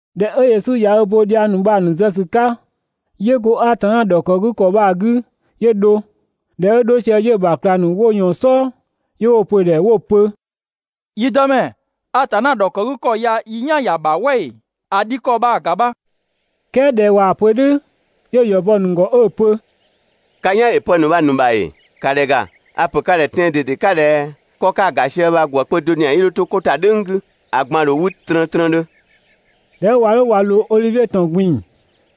꞊Dhɛ 'ö Yesu ‑ya ö bo dhiang ‑nu bha‑ ‑nu zë ‑sü 'ka, 'yö go Atanna ‑dhɔkëgükɔ bha‑ 'gü 'yö dho. ꞊Dhɛ 'ö 'dho sië 'yö‑ ‑bha ꞊klang ‑nu 'wo ꞊yɔɔn‑ "sɔɔ, 'yö 'wo‑ pö‑ ‑dhɛ 'wo‑ pö: «Yi Dëmɛ, Atanna ‑dhɔkëgükɔ ya i "yan ‑ya ‑bha "wɛ ‑ee? ‑A dhi ‑kɔ bha‑ ‑ga bha!» "Kɛɛ ꞊dhɛ ꞊waa‑ pö "dhʋ̈, 'yö‑ ‑yɔ bɔ‑ ‑nu ‑gɔ 'ö‑ pö: «Ka "yan ‑yö pë ‑nu bha‑ ‑nu ‑bha ‑ee? ‑Ka ‑dhɛ ‑ga! A‑ ‑pö ka ‑dhɛ tɛan‑ ꞊dede 'ka ꞊dhɛ: 'Kɔ 'ka‑ ‑ga sië bha‑ ‑gwë kpö do ‑zian 'yii 'dho 'to 'ko ‑ta "dhʋ̈ng 'gü, ‑a ꞊gban ‑dho 'wü trëntrëndhö.» ꞊Dhɛ 'ö ꞊wa 'dho ꞊wa ꞊loo Odhivie ‑tɔn ꞊gbin‑,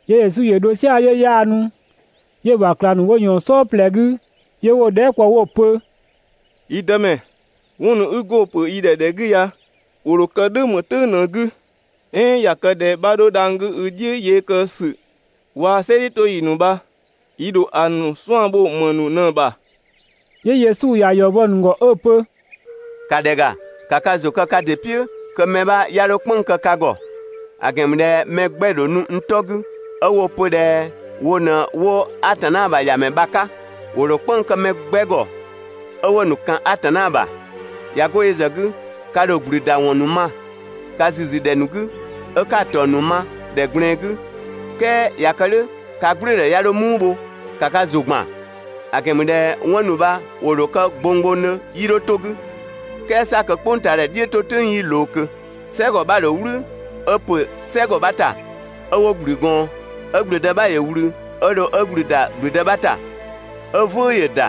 'yö Yesu ‑yö dho "sia‑ 'yö 'yaanu, 'yö‑ ‑bha ꞊klang ‑nu 'wo ꞊yɔɔn‑ "sɔɔ ꞊plɛ 'gü 'yö 'wo‑ dhɛɛ" kpɔ 'wo‑ pö: «Yi Dëmɛ, 'wɔn ‑nu 'i go‑ ‑pö yi ‑dhɛ ‑dhɛ 'gü ya, ‑wo ‑dho kë "dhʋ̈ ‑më "tʋ̈ng ꞊në‑ 'gü, "ɛɛn ꞊ya kë ꞊dhɛ 'bha 'dho dhang‑ 'gü i "dhiʋ̈ yee kë ‑sü waa‑ "sɛ "dhiʋ̈toyi ‑nu bha, yi ‑dho ‑a ‑nu 'suan‑ bho ‑më ‑nu ꞊në‑ ‑bha?» 'Yö Yesu ‑ya ‑yɔ bɔ‑ ‑nu ‑gɔ 'ö‑ pö: «‑Ka ‑dhɛ ‑ga, ‑ka ka ‑zʋ kë ka ‑dɩ "piʋ̈ kö mɛ 'bha 'ya 'dho "kpënng‑ kë ka ‑gɔ. ‑A ‑gɛn ‑mü ꞊dhɛ mɛ 'gbɛ‑ ‑dho nu n 'tɔ 'gü 'ö 'wo‑ pö ꞊dhɛ wo ꞊në 'wo Atanna ‑bha ‑Yamɛ bha‑ 'ka. ‑Wo ‑dho "kpënng‑ kë mɛ 'gbɛ ‑gɔ 'ö 'wo‑ ‑nu ‑kan Atanna ‑bha. ꞊Ya 'go yö ‑zë 'gü, ka ‑dho ‑gblü ‑da ‑wɔn ‑nu ma ka ‑züzü ‑dhɛ ‑nu 'gü 'ö 'ka‑ ‑taɔng ‑nu ma ‑dhɛ ꞊gblɛɛn 'gü, "kɛɛ ꞊ya kë "dhʋ̈ ka "gblʋ̈ʋ̈dhɛ 'ya 'dho "muu bho, ‑ka ka ‑zʋ ‑gban, ‑a ‑gɛn ‑mü ꞊dhɛ 'wɔn ‑nu 'bha ‑wo ‑dho kë gbonggbongdhö 'yii 'dho 'to‑ 'gü, "kɛɛ 'sa kö "kpʋngtaadhɛ "dhiʋ̈toyi 'yii ꞊loo ꞊kö. "Sɛgɔ 'bha‑ ‑dho "wlü 'ö ‑pö "sɛgɔ 'bha‑ ‑ta 'ö 'wo ‑gblü gɔɔn, 'ö ‑gblüdë 'bha ‑yö ꞊wlü 'ö dho 'ö ‑gblü ‑da ‑gblüdë 'bha ‑ta, 'ö "vʋ̈ʋ̈ ‑yö ‑da,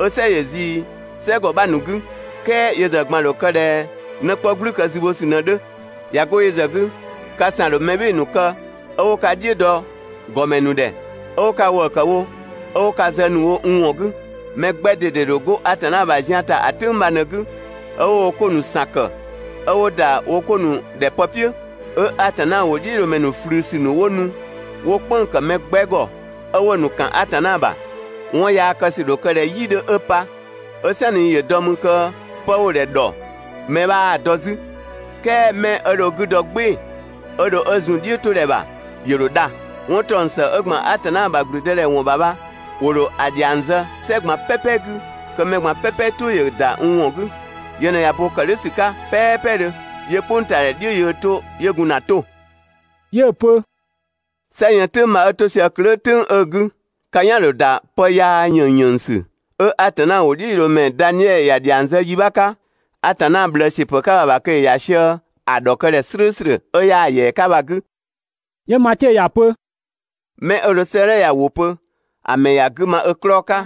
'ö "sɛ ‑yö ꞊zii "sɛgɔ 'bha ‑nu 'gü. "Kɛɛ yö ‑zë ꞊gban ‑dho kë ꞊dhɛ 'në 'kpɔ "gblükë zü bho ‑sü ꞊në‑ 'dhö. ꞊Ya 'go yö ‑zë 'gü, ka ‑san ‑dho mɛ "bhɩɩ‑ ‑nu kë 'ö 'wo ka "dhiʋ̈ dɔ ‑gɔmɛ ‑nu ‑dhɛ, 'ö 'wo ka ‑wëë ‑kë wo 'ö 'wo ka zë ‑nu wo n ‑wɔn 'gü. Mɛ 'gbɛ ꞊dede ‑dho 'go Atanna ‑bha zian ‑ta ‑a "tʋ̈ng bha ꞊në‑ 'gü 'ö 'wo wo 'ko ‑nu ‑san ‑kë 'ö 'wo ‑da wo 'ko ‑nu ‑dhɛ pë "piʋ̈. 'Ö Atanna ‑wʋdhiʋ̈loomɛ ꞊flüsü ‑nu 'wo nu 'wo‑ "kpënng‑ ‑kë mɛ 'gbɛ ‑gɔ 'ö 'wo‑ ‑nu ‑kan Atanna ‑bha. 'Wɔn yaa kë ‑sü ‑dho kë ꞊dhɛ "yi 'dhö 'ö pa, 'ö "sanni ‑yö dɔ 'mü kö pë 'wo‑ ‑dhɛ ‑dhɔ, mɛ 'bhaa‑ dɔ 'zü. "Kɛɛ 'mɛ 'ö dho ö 'gü dɔ "gbɩɩ‑ 'ö 'dho 'ö zun‑ "dhiʋ̈todhɛ ‑bha ‑yö ‑dho dha. 'Wɔn ‑taɔng ‑së 'ö ‑gban Atanna ‑bha ‑gblüdëdhɛ ‑wɔn ‑bha bha ‑wo ‑dho ‑a ‑dhiang zë "sɛ ꞊gban "pɛpɛ 'gü kö mɛ ꞊gban "pɛpɛ "tʋ ‑yö ‑da n ‑wɔn 'gü. Yö ꞊në ꞊ya bo ‑kë "dhʋ̈ ‑sü 'ka "pɛɛpɛdhö, 'yö "kpʋngtaadhɛ "dhiʋ̈ yöö 'to 'yö gun ‑na 'to.» 'Yö‑ pö: «"Sɛ yën "tʋ̈ng bha 'ö 'to sië klöö" "tʋ̈ng 'ö‑ 'gü, ka "yan‑ ‑dho ‑da pë yaa ‑yënng ‑yënngsü 'ö Atanna ‑wʋdhiʋ̈loomɛ Daniɛ ‑ya ‑dhiang zë yi 'bha 'ka, Atanna ꞊bhlëë ‑siö ‑pë 'ka bha‑ ‑bha kö ‑yö ‑ya sië‑ ‑dhɔkëdhɛ "slʋ̈ʋ̈slʋ̈ 'ö 'yaa‑ ‑yɛa 'ka bha‑ 'gü. ('Yö Matiö ‑ya pö) 'mɛ 'ö dho 'sëëdhɛ ya‑ ‑wʋ pö, ‑a ‑mɛ ‑ya 'gü ma ö 'klɔɔ‑ 'ka!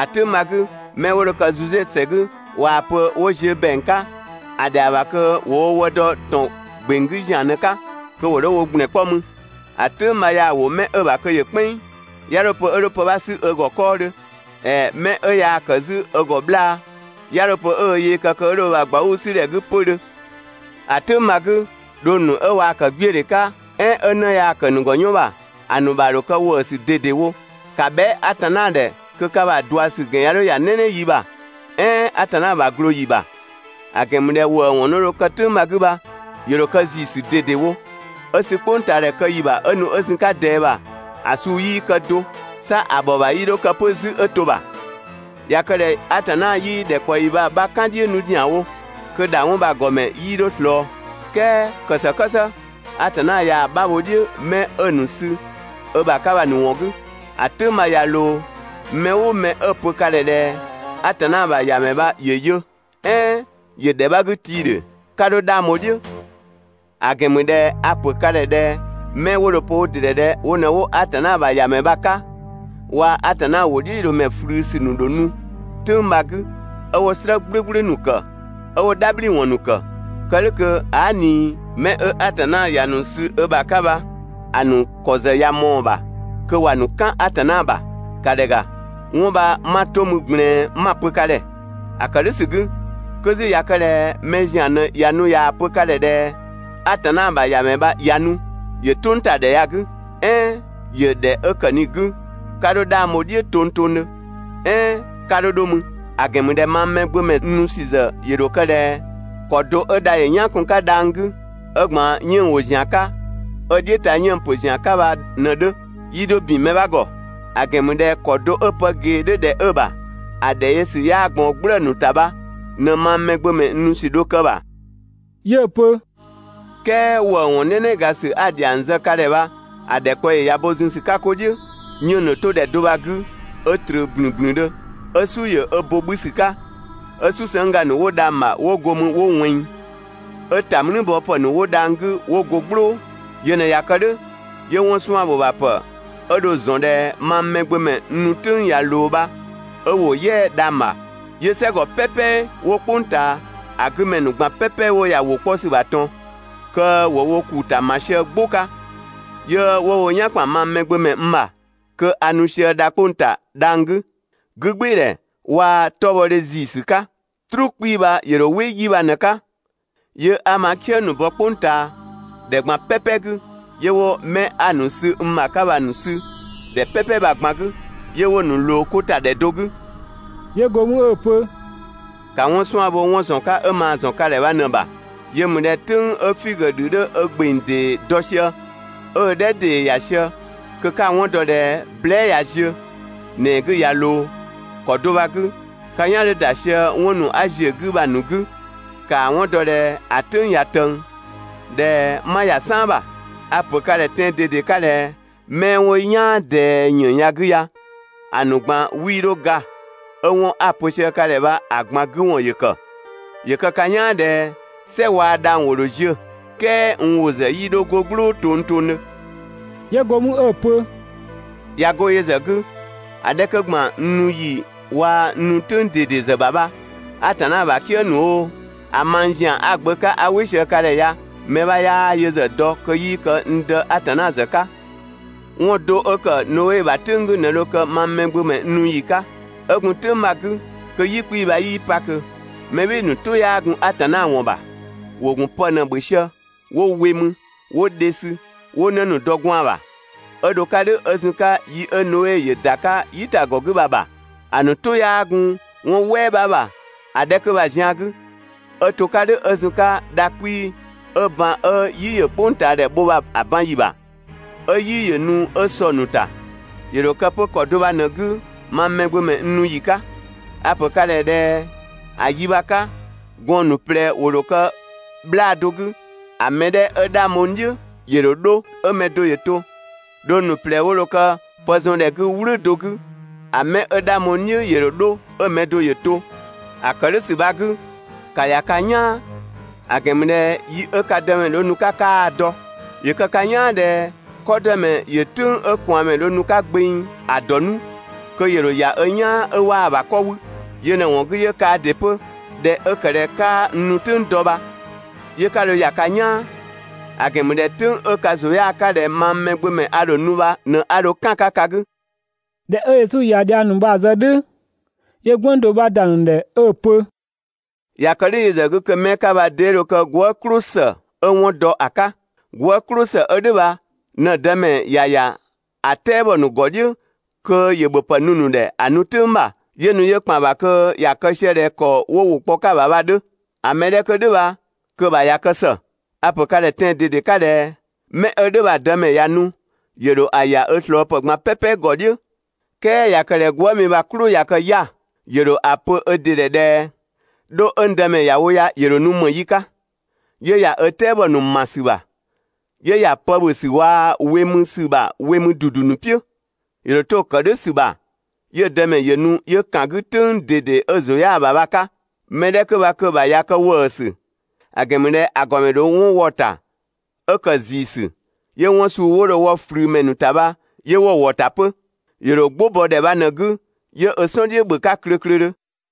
‑A "tʋ̈ng bha‑ 'gü, 'mɛ 'wo dho kë Zude ‑sɛ 'gü ꞊waa‑ pö 'wo ziö ‑bɛang 'ka ‑a ‑dhɛa ‑bha kö ‑wo wo wë dɔ ‑tɔn ‑gbeng 'gü ‑zian ꞊në‑ 'ka kö ‑wo 'dho wo ‑gblɛn 'kpɔ mü. ‑A "tʋ̈ng bha yaa‑ wo 'mɛ 'ö‑ ‑bha kö ‑yö "kpɛnng, 'ya 'dho‑ pö 'ö 'dho pë 'bha 'sü ö ‑gɔ 'kɔɔdhö. ‑Ɛɛ 'mɛ 'ö yaa‑ kë 'zü ö ‑gɔ 'bhlaa‑, 'ya 'dho‑ pö 'ö ö yee kë kö 'ö 'dho ö ‑bha ꞊gbauu‑ 'sü ‑dhɛ 'gü 'pödhö. ‑A "tʋ̈ng bha‑ 'gü, dhong ‑nu 'ö waa‑ ‑kë 'gbiödhe 'ka, "ɛɛn 'ö 'në ꞊yaa‑ ‑kë ‑a ‑nu ‑gɔ 'yɔn ‑bha ‑a ‑nu ‑bha ‑dho kë ‑wëësü ꞊dedewo! ‑Ka bhɛa" Atanna ‑dhɛ kö ka ‑bha ꞊dua ‑sü ‑gɛn 'ya 'dho ‑ya "nɛnɛ yi ‑bha "ɛɛn Atanna ‑bha ꞊glooyi ‑bha! ‑A ‑gɛn ‑mü ꞊dhɛ ‑wëëwɔn ‑nu 'wo dho kë "tʋ̈ng bha‑ 'gü bha, ‑yö ‑dho kë ‑ziisü ꞊dedewo. 'Ö sü "kpʋngtaadhɛ kë ‑yi ‑bha 'ö nu 'ö zun‑ 'ka ꞊dɛɛ ‑bha, ‑a suu 'yii kë do, 'sa ‑a ‑bhɔ ‑bha 'yii 'dho kë 'pö 'zü 'ö to‑ ‑bha. ꞊Ya kë ꞊dhɛ Atanna 'yii ‑dhɛkpaɔyi bha‑ 'bha "kan‑ "dhiʋ̈ 'nu ‑zianwo kö ‑dha 'wɔn bha‑ ‑gɔ ‑mɛ 'yii 'dho ꞊slɔɔ. "Kɛɛ ‑kë ‑së "kë "së, Atanna ꞊yaa‑ 'bha bho‑ "dhiʋ̈ 'mɛ 'ö‑ ‑nu sü ö ‑bha 'ka bha‑ ‑nu ‑wɔn 'gü. ‑A "tʋ̈ng bha ꞊ya ꞊loo, mɛ "ʋʋ mɛ 'ö‑ pö ka ‑dhɛ ꞊dhɛ: ‹Atanna ‑bha ‑Yamɛ bha ‑yö yö!› "ɛɛn ‹‑Yö ‑dhɛ 'bha 'gü tii‑ ‑dhe!› 'ka 'dho 'dhang bho‑ "dhiʋ̈! ‑A ‑gɛn ‑mü ꞊dhɛ a‑ ‑pö ka ‑dhɛ ꞊dhɛ 'mɛ 'wo dho‑ pö wo ‑dɩ ‑dhɛ ꞊dhɛ wo ꞊në 'wo Atanna ‑bha ‑Yamɛ bha‑ 'ka, waa‑ Atanna ‑wʋdhiʋ̈loomɛ ꞊flüsü ‑nu ‑dho nu "tʋ̈ng bha‑ 'gü, 'ö 'wo "slë "gblʋ̈gblʋ̈ ‑nu ‑kë 'ö 'wo "dhabhliwɔn ‑nu ‑kë, kë "dhʋ̈ kö aa" ꞊ni 'mɛ 'ö Atanna ‑ya ‑nu sü ö ‑bha 'ka bha, ‑a ‑nu ‑kɔ ‑zë ꞊ya ꞊mɔɔ‑ ‑bha kö ‑wa ‑nu "kan Atanna ‑bha. ‑Ka ‑dhɛ ‑ga! 'Wɔn bha 'ma‑ 'to mü ꞊gblɛɛn 'ma‑ pö ka ‑dhɛ. ‑A ‑kë "dhʋ̈ ‑sü 'gü, kö 'zü ꞊ya kë ꞊dhɛ mɛ ‑zian ꞊në ꞊ya nu ꞊yaa‑ pö ka ‑dhɛ ꞊dhɛ ‹Atanna ‑bha ‑Yamɛ bha ꞊ya nu, ‑yö "tʋngtadhɛ ya‑ 'gü!› "ɛɛn ‹‑Yö ‑dhɛ 'ö ‑kë ꞊ni‑ 'gü!› 'ka 'dho 'dhang bho‑ "dhiʋ̈ tongtongdhö "ɛɛn 'ka 'dho 'dho mü. ‑A ‑gɛn ‑mü ꞊dhɛ mang Mɛgbömɛ n nu ‑sü ‑zë ‑yö ‑dho kë ꞊dhɛ ‑kɔ do 'ö dha ‑yö "yan kun‑ 'ka dhang‑ 'gü, 'ö ‑gban 'yënng‑ ‑wo ‑zian 'ka, 'ö "dhiʋ̈ ta 'yënng‑ ‑pö ‑zian 'ka bha ꞊në‑ 'dhö, 'yii 'dho ‑bin mɛ 'bha ‑gɔ. ‑A ‑gɛn ‑mü ꞊dhɛ ‑kɔ do 'ö pë ꞊gee 'dhö ‑dhɛ 'ö‑ ‑bha ‑a ‑dhɛ yö ‑sü 'yaa ꞊gbaɔn "gblëë‑ ‑nu ‑ta bha, ꞊në mang Mɛgbömɛ n nu ‑sü dho kë‑ ‑bha.» 'Yö‑ pö: «"Kɛɛ ‑wëëwɔn "nɛnɛgasü 'a‑ ‑dhiang zë ka ‑dhɛ bha‑ ‑dhɛkpaɔyi ya bo zun ‑sü 'ka 'ko "dhiʋ̈, 'yënng‑ ‑dho 'to ‑dhɛ do bha‑ 'gü 'ö ꞊tröö ‑blünblündhö, 'ö "su ‑yö ö bo 'bhü ‑sü 'ka, 'ö "susëngga ‑nu 'wo dhang‑ ‑bha 'wo go 'mü 'wo ꞊wɛnng. 'Ö ‑ta "mlüü bɔ ‑pë ‑nu 'wo dhang‑ 'gü 'wo go "gblʋ̈ʋ̈‑. Yö ꞊në ꞊ya kë "dhʋ̈, 'yö 'wɔn 'suan‑ ‑bho ‑bha ‑pë 'ö dho‑ ‑zɔn ‑dhɛ mang Mɛgbömɛ n nu "tʋ̈ng ꞊ya ꞊loo bha 'ö ‑wo "yɛa‑ dhang‑ ‑bha, 'yö "sɛgɔ "pɛpɛ 'wo "kpʋng ꞊taa ‑a 'gü ‑mɛ ‑nu ꞊gban "pɛpɛ 'wo ‑ya ‑wʋ 'kpɔ ‑sü ‑bha ꞊tɔn, kö ‑wo wo ‑kuu ‑ta ‑ma sië "gbʋ 'ka, 'yö 'wo wo "yan ‑kpan mang Mɛgbömɛ n ‑bha kö a nu sië dha 'kpong‑ ‑ta dhang‑ 'gü, 'gügbɩɩdhɛ waa‑ 'tɔbhɔdhe ‑ziisü 'ka. "Truu 'kpii‑ bha ‑yö ‑dho "wɩ 'yi bha ꞊në‑ 'ka, 'yö 'a ma "kië ‑nu bɔ "kpʋngtaadhɛ ꞊gban "pɛpɛ 'gü, 'yö 'wo 'mɛ 'a‑ ‑nu sü n ‑bha 'ka bha‑ ‑nu sü ‑dhɛ "pɛpɛ bha‑ ꞊gban 'gü, 'yö 'wo‑ ‑nu ꞊loo 'ko ‑ta ‑dhɛ do 'gü.» 'Yö 'go mü 'ö‑ pö: «‑Ka 'wɔn 'suan‑ bho 'wɔn ‑zɔn 'ka 'ö maa‑ ‑zɔn ka ‑dhɛ bha ꞊në‑ ‑bha. Yö ‑mü ꞊dhɛ "tʋ̈ng 'ö figö ‑dhü 'dhö ö ‑gbeng ‑dee dɔ sië, 'ö ö "dhɛ ‑dee ‑ya sië kö 'ka‑ 'wɔn dɔ ꞊dhɛ blɛa" ꞊ya ziö, ‑nɛɛ 'gü ꞊ya ꞊loo. ‑Kɔ do bha‑ 'gü, ka "yan 'dhö ‑da sië 'wɔn ‑nu 'a ‑ziö 'gü bha‑ ‑nu 'gü, ‑kaa 'wɔn dɔ ꞊dhɛ ‑a "tʋ̈ng ꞊ya ꞊tëng, ꞊dhɛ 'ma ‑ya "saan ‑bha. A‑ ‑pö ka ‑dhɛ tɛan‑ ꞊dede 'ka ꞊dhɛ 'mɛ 'wo "yaan ꞊dɛɛ ‑yën ya‑ 'gü ya, ‑a ‑nu ꞊gban 'wii 'dho ga 'ö 'wɔn 'a‑ pö sië ka ‑dhɛ bha‑ ꞊gban 'gü ‑wɔn ‑yö ‑kë. ‑Yö kë ka "yaan ꞊dhɛ "sɛ waa‑ dhang‑ ‑wo ‑dho ziö, "kɛɛ n ‑wʋ ‑zë do 'yii 'dho 'go "gblʋʋ tongtongdhö.» 'Yö go mü 'ö‑ pö: «꞊Ya 'go yö ‑zë 'gü, ‑a 'dhɛ 'kö ‑gban n nu ‑yi waa‑ n nu "tʋ̈ng ꞊dede ‑zë ‑bha bha, Atanna ‑bha "kië ‑nu oo, ‑a mang ‑zian 'a‑ Gbö 'ka 'a "wɩ sië ka ‑dhɛ ya mɛ 'bha 'yaa yö ‑zë dɔ kö 'yii kë n Dë Atanna ‑zë 'ka. 'Wɔn do 'ö ‑kë Noe ‑bha "tʋ̈ng 'gü ꞊në dho kë mang Mɛgbömɛ n nu ‑yi 'ka. 'Ö gun "tʋ̈ng bha‑ 'gü, kö "yi 'kpii‑ bha 'yii pa ꞊kö mɛ "bhɩɩ‑ ‑nu "tʋ 'yaa gun Atanna ‑wɔn ‑bha, ‑wo ‑gun pë ꞊në‑ ‑bhö sië, 'wo we mü, 'wo dhe sü, 'wo 'në ‑nu dɔ gwaan‑ ‑bha 'ö dho‑ 'ka "dhʋ̈ 'ö zun‑ 'ka yi 'ö Noe ‑yö ‑da 'ka "yitagɔ 'gü bha‑ ‑bha. ‑A ‑nu "tʋ 'yaa gun 'wɔn "wɛɛ 'bha ‑bha ‑a 'dhɛ 'kö bha‑ zian 'gü 'ö 'to‑ 'ka "dhʋ̈ 'ö zun‑ 'ka dha 'kpii‑ 'ö ban 'ö "yi ‑yö "kpʋngtaadhɛ bho bha‑ ban ‑yi ‑bha, 'ö "yi ‑yö nu 'ö sɔ‑ ‑nu ‑ta. ‑Yö ‑dho kë 'pö ‑kɔ do bha ꞊në‑ 'gü mang Mɛgbömɛ n nu ‑yi 'ka. A‑ ‑pö ka ‑dhɛ ꞊dhɛ ‑a 'yi bha‑ 'ka, gɔɔn‑ ‑nu ꞊plɛ 'wo dho kë 'bhlaa‑ do 'gü, ‑a mɛ 'dhɛ 'ö 'dhang bho n "dhiʋ̈ ‑yö ‑dho 'dho 'ö‑ mɛ do ‑yö to. Dhong ‑nu ꞊plɛ 'wo dho kë pë zɔn ‑dhɛ 'gü "wlʋ̈ do 'gü, ‑a mɛ 'ö 'dhang bho n "dhiʋ̈ ‑yö ‑dho 'dho 'ö‑ mɛ do ‑yö to. ‑A ‑kë "dhʋ̈ ‑sü bha‑ 'gü, ‑ka ‑ya ka "yaan, ‑a ‑gɛn ‑mü ꞊dhɛ yi 'ö ka Dëmɛ dho nu‑ 'ka 'kaa‑ dɔ. ‑Yö kë ka "yaan ꞊dhɛ 'kɔdëmɛ ‑yö "tʋ̈ng 'ö ꞊kwaanmɛ dho nu‑ 'ka gbeng ‑a ‑dɔ 'nu kö ‑yö ‑dho ‑ya ö "yaan 'ö 'waa‑ ‑bha 'kɔ 'wü. Yö ꞊në‑ ‑wɔn 'gü 'yö kaa ‑dɩ 'pö ꞊dhɛ 'ö ‑kë ꞊dhɛ 'kaa n nu "tʋ̈ng dɔ bha, 'yö ka ‑dho ‑ya ka "yaan; ‑a ‑gɛn ‑mü ꞊dhɛ "tʋ̈ng 'ö ka ‑zʋ 'yaa 'ka ꞊dhɛ mang Mɛgbömɛ a ‑dho nu bha ꞊në 'a dho "kan‑ 'ka ka 'gü.» ꞊Dhɛ 'ö Yesu ꞊ya dhiang ‑nu bha‑ zë "dhʋ̈, 'yö "gwënng do 'bha ‑da ‑nu ‑dhɛ 'ö‑ pö: «꞊Ya kë "dhʋ̈ yö ‑zë 'gü kö 'mɛ 'ka bha 'dee dho kë gwëë" "klʋsë 'ö 'wɔn dɔ ‑a 'ka? Gwëë" "klʋsë 'ö "dhʋ̈ bha ꞊në‑ dëmɛ ‑ya ‑ya ‑a "tɛabɔ ‑nu ‑gɔ "dhiʋ̈ kö ‑yö ‑bhöpë nu‑ ‑nu ‑dhɛ ‑a nu "tʋ̈ng ‑bha 'yö nu 'yö ‑kpan ‑bha kö ‑ya kë sië ꞊dhɛ ‑kɔ 'wo ‑wʋ kpɔ 'ka‑ ‑bha bha‑ 'dhö. ‑A mɛ 'dhɛ 'kö "dhʋ̈ bha kö‑ ‑bha ꞊ya kë ‑së. A‑ ‑pö ka ‑dhɛ tɛan‑ ꞊dede 'ka ꞊dhɛ: «Mɛ 'ö "dhʋ̈ bha‑ dëmɛ ꞊ya nu, ‑yö ‑dho ‑a ‑ya ö ꞊slɔɔpë ꞊gban "pɛpɛ ‑gɔ "dhiʋ̈. "Kɛɛ ꞊ya kë ꞊dhɛ gwëëmi bha‑ "klʋ ꞊ya kë 'ya‑, ‑yö ‑dho ‑a pö ö ‑dɩ ‑dhɛ ꞊dhɛ: «'Dho 'ö n dëmɛ ‑ya wo ya, ‑yö ‑dho nu ‑më yi 'ka?» 'Yö ‑ya ö "tɛabɔ ‑nu ‑ma ‑sü ‑bha, 'yö ‑ya pë ‑bhö ‑sü waa‑ we mü ‑sü ‑bha we mü ‑dudu ‑nu "piʋ̈. ‑Yö ‑dho 'to‑ ‑kë "dhʋ̈ ‑sü ‑bha, 'yö‑ dëmɛ ‑yö nu 'yö ‑kan 'gü "tʋ̈ng ꞊dede 'ö‑ ‑zʋ 'yaa‑ ‑bha bha‑ 'ka. Mɛ 'dhɛ 'kö bha kö‑ ‑bha ꞊ya kë ‑wëësü, ‑a ‑gɛn ‑mü ꞊dhɛ ‑a ‑gɔmɛ ‑dho 'wɔn wɔ‑ ‑ta 'ö ‑kë ‑ziiziisü, 'yö 'wɔn suu 'wo dho‑ wɔ ꞊flümɛ ‑nu ‑ta bha, 'yö 'wo‑ ‑wɔ ‑ta 'pö. ‑Yö ‑dho "gbʋ bɔ ‑dhɛ bha ꞊në‑ 'gü 'yö ö "sɔn "dhiʋ̈ ‑bhö 'ka klöklödhö.»